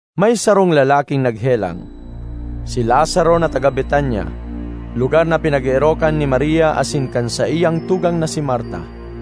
May sarong lalaking naghelang, si Lazaro na taga Betania, lugar na pinag-eerokan ni Maria asin kan saiyang tugang na si Marta.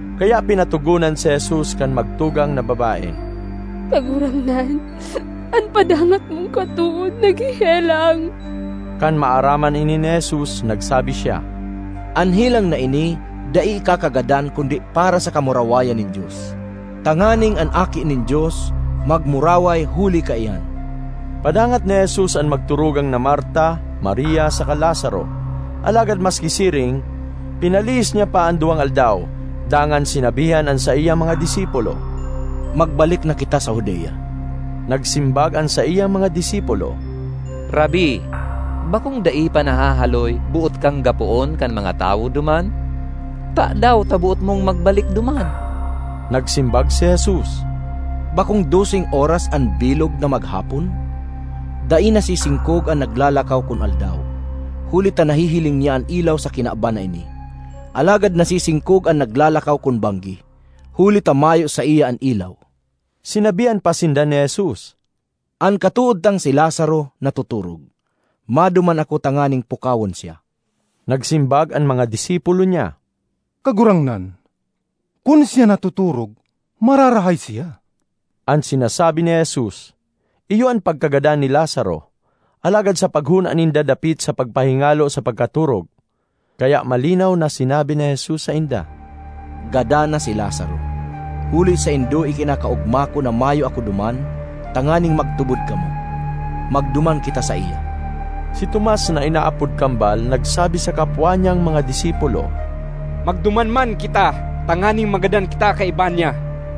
Kaya pinatogonan si Jesus kan magtugang na babae, “Kagurangnan, an padangat mong katood naghehelang.” Kan maaraman ini ni Jesus, nagsabi siya, “An helang na ini dai ikakagadan kundi para sa kamurawayan nin Dios, tanganing an Aki nin Dios magmuraway huli kaiyan.” Padangat ni Jesus an magturugang na Marta, Maria, saka Lazaro. Alagad maski siring, pinalihis niya pa an duwang aldaw, dangan sinabihan an saiyang mga disipulo, “Magbalik na kita sa Judea.” Nagsimbag an saiyang mga disipulo, “Rabbi, bakong dai pa nahahaloy boot kang gapoon kan mga tawo duman? Tadaw ta boot mong magbalik duman?” Nagsimbag si Jesus, “Bakong doseng oras an bilog na maghapon? Dai nasisingkog an naglalakaw kun aldaw, huli ta nahihiling niya an ilaw sa kinaban na ini. Alagad nasisingkog an naglalakaw kun banggi, huli ta mayo saiya an ilaw.” Sinabihan pa sinda ni Jesus, “An katood tang si Lazaro natotorog. Maduman ako tanganing pukawon siya.” Nagsimbag an mga disipulo niya, “Kagurangnan, kun siya natotorog, mararahay siya.” An sinasabi ni Jesus, iyo an pagkagadan ni Lazaro. Alagad sa paghona ninda dapit sa pagpahingalo sa pagkatorog. Kaya malinaw na sinabi ni Jesus sainda, “Gadan na si Lazaro. Huli saindo ikinakaogma ko na mayo ako duman tanganing magtubod kamo. Magduman kita saiya.” Si Tomas (na inaapod Kambal) nagsabi sa kapwa niyang mga disipulo, “Magduman man kita tanganing magadan kita kaiba niya.”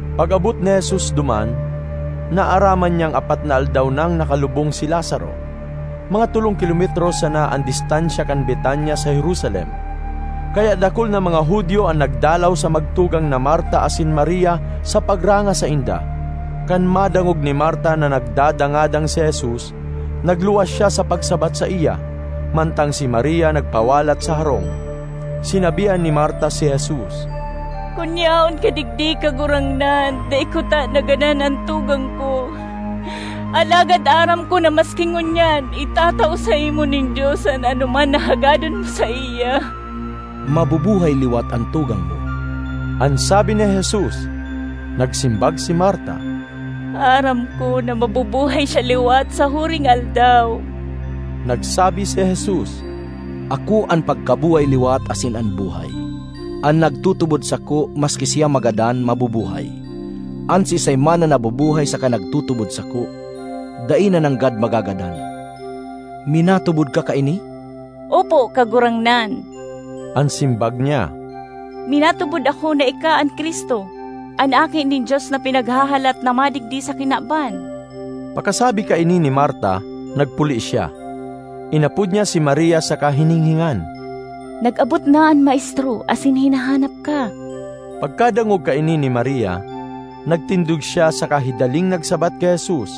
Pag-abot ni Jesus duman, naaraman niyang apat na aldaw nang nakalubong si Lazaro. Mga tolong kilometro sana an distansya kan Betania sa Jerusalem, kaya dakul na mga Judio an nagdalaw sa magtugang na Marta asin Maria sa pagranga sainda. Kan madangog ni Marta na nagdadangadang si Jesus, nagluwas siya sa pagsabat saiya, mantang si Maria nagpawalat sa harong. Sinabihan ni Marta si Jesus, “Kun yaon ka digdi, Kagurangnan, dai kutana nagadan an tugang ko! Alagad aram ko na maski ngunyan itatao saimo nin Dios an anoman na hagadon mo saiya.” ”Mabubuhay liwat an tugang mo,” an sabi ni Jesus. Nagsimbag si Marta, “Aram ko na mabubuhay siya liwat sa huring aldaw.” Nagsabi si Jesus, “Ako an pagkabuhay-liwat asin an buhay. An nagtutubod sako, maski siya magadan, mabubuhay; an siisay man na nabubuhay saka nagtutubod sako, dai na nanggad magagadan. Minatubod ka kaini?” ”Opo, Kagurangnan!” an simbag niya. “Minatubod ako na ika an Cristo, an Aki nin Dios na pinaghahalat na madigdi sa kinaban.” Pakasabi kaini ni Marta, nagpuli siya. Inapod niya si Maria saka hininghingan, “Nag-abot na an Maestro asin hinahanap ka.” Pagkadangog kaini ni Maria, nagtindog siya saka hidaling nagsabat ki Jesus.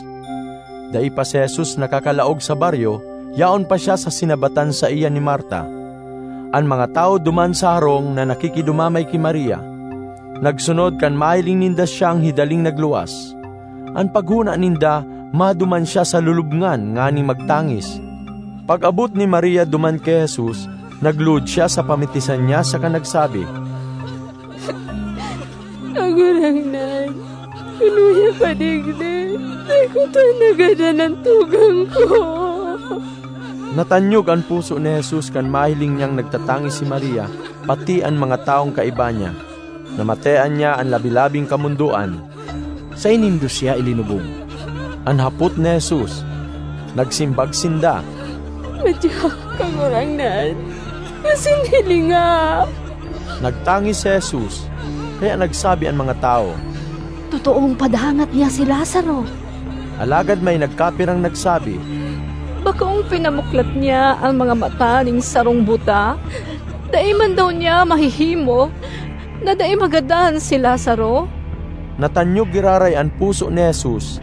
(Dai pa si Jesus nakakalaog sa baryo; yaon pa siya sa sinabatan saiya ni Marta.) An mga tawo duman sa harong na nakikidumamay ki Maria, nagsunod kan mahiling ninda siyang hidaling nagluwas. An paghona ninda maduman siya sa lulubngan nganing magtangis. Pag-abot ni Maria duman ki Jesus, nagluhod siya sa pamitisan niya saka nagsabi, “Kagurangnan, kun uya ka digdi, dai kutana nagadan an tugang ko!” Natanyog an puso ni Jesus kan mahiling niyang nagtatangis si Maria pati an mga tawong kaiba niya; namatean niya an labi-labing kamondoan. ”Saen nindo siya ilinubong?” an hapot ni Jesus. Nagsimbag sinda, “Madya, Kagurangnan, asin hilinga.” Nagtangis si Jesus. Kaya nagsabi an mga tawo, “Totoong padangat niya si Lazaro!” Alagad may nagkapirang nagsabi, “Bakong pinamuklat niya an mga mata nin sarong buta? Dai man daw niya mahihimo na dai magadan si Lazaro?” Natanyog giraray an puso ni Jesus;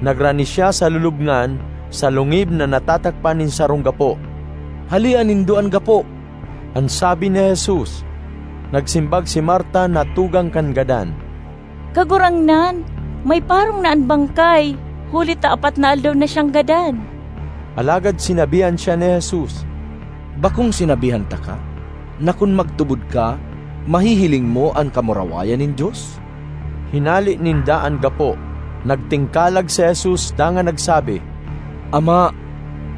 nagrani siya sa lulubngan, sa lungib na natatakpan nin sarong gapo. ”Halea nindo an gapo!” an sabi ni Jesus. Nagsimbag si Marta na tugang kan gadan, “Kagurangnan, may parong na an bangkay huli ta apat na aldaw na siyang gadan!” Alagad sinabihan siya ni Jesus, “Bakong sinabihan taka, na kun magtubod ka, mahihiling mo an kamurawayan nin Dios?” Hinale ninda an gapo. Nagtingkalag si Jesus dangan nagsabi, “Ama,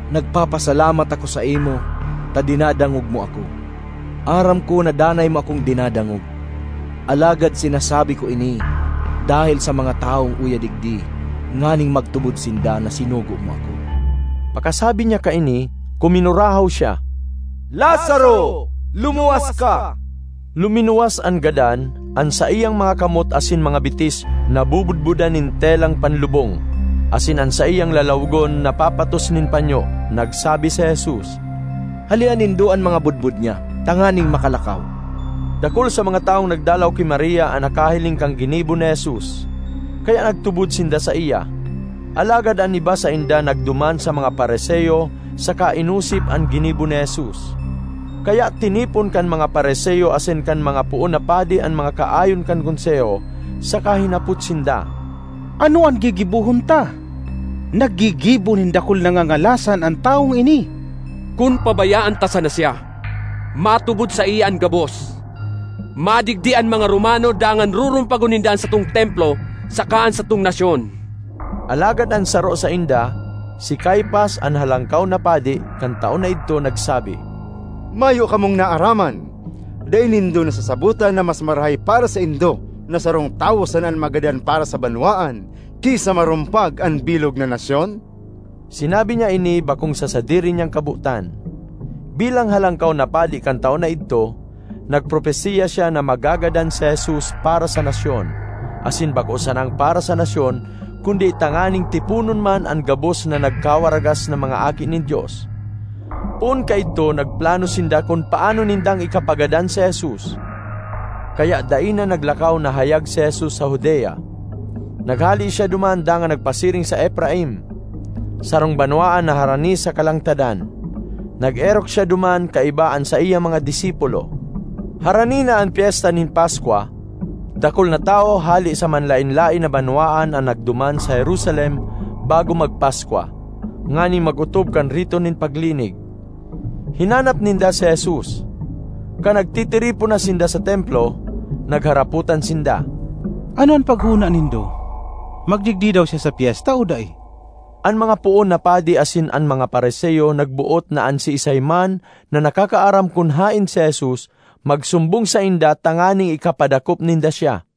nagpapasalamat ako saimo, ta dinadangog mo ako. Aram ko na danay mo akong dinadangog, alagad sinasabi ko ini dahel sa mga tawong uya digdi nganing magtubod sinda na sinugo mo ako.” Pakasabi niya kaini, kuminurahaw siya, “Lazaro, lumuwas ka!” Luminuwas an gadan; an saiyang mga kamot asin mga bitis nabobodbodan nin telang panlubong, asin an saiyang lalawogon napapatos nin panyo. Nagsabi si Jesus, “Halea nindo an mga bodbod niya tanganing makalakaw.” Dakul sa mga tawong nagdalaw ki Maria an nakahiling kan ginibo ni Jesus, kaya nagtubod sinda saiya. Alagad an iba sainda nagduman sa mga Fariseo saka inosip an ginibo ni Jesus. Kaya tinipon kan mga Fariseo asin kan mga poon na padi an mga kaayon kan Konseho, saka hinapot sinda, “Ano an gigibohon ta? Naggigibo nin dakul na ngangalasan an tawong ini! Kun pabayaan ta sana siya, matubod saiya an gabos. Madigdi an mga Romano dangan rurumpagon ninda an satong Templo saka an satong nasyon!” Alagad an saro sainda, si Caifas an Halangkaw na Padi kan taon na idto, nagsabi, “Mayo kamong naaraman! Dai nindo nasasabotan na mas marahay para saindo na sarong tawo sana an magadan para sa banwaan, ki sa marumpag an bilog na nasyon?” Sinabi niya ini bakong sa sadiri niyang kabotan. Bilang Halangkaw na Padi kan taon na idto, nagpropesiya siya na magagadan si Jesus para sa nasyon asin bako sanang para sa nasyon, kundi tanganing tiponon man an gabos na nagkawaragas na mga aki nin Dios. Poon kaidto nagplano sinda kun paano nindang ikapagadan si Jesus. Kaya dai na naglakaw na hayag si Jesus sa Judea. Naghale siya duman dangan nagpasiring sa Efraim, sarong banwaan na harani sa kalangtadan. Nag-erok siya duman kaiba an saiyang mga disipulo. Harani na an Pyesta nin Paskwa. Dakul na tawo hale sa manlaen-laen na banwaan an nagduman sa Jerusalem bago magpaskwa, nganing mag-otob kan rito nin paglinig. Hinanap ninda si Jesus. Kan nagtitiripon na sinda sa Templo, nagharapotan sinda, “Ano an paghona nindo? Magdigdi daw siya sa pyesta o dai?” An mga poon na padi asin an mga Fariseo nagboot na an siisay man na nakakaaram kun haen si Jesus, magsumbong sainda tanganing ikapadakop ninda siya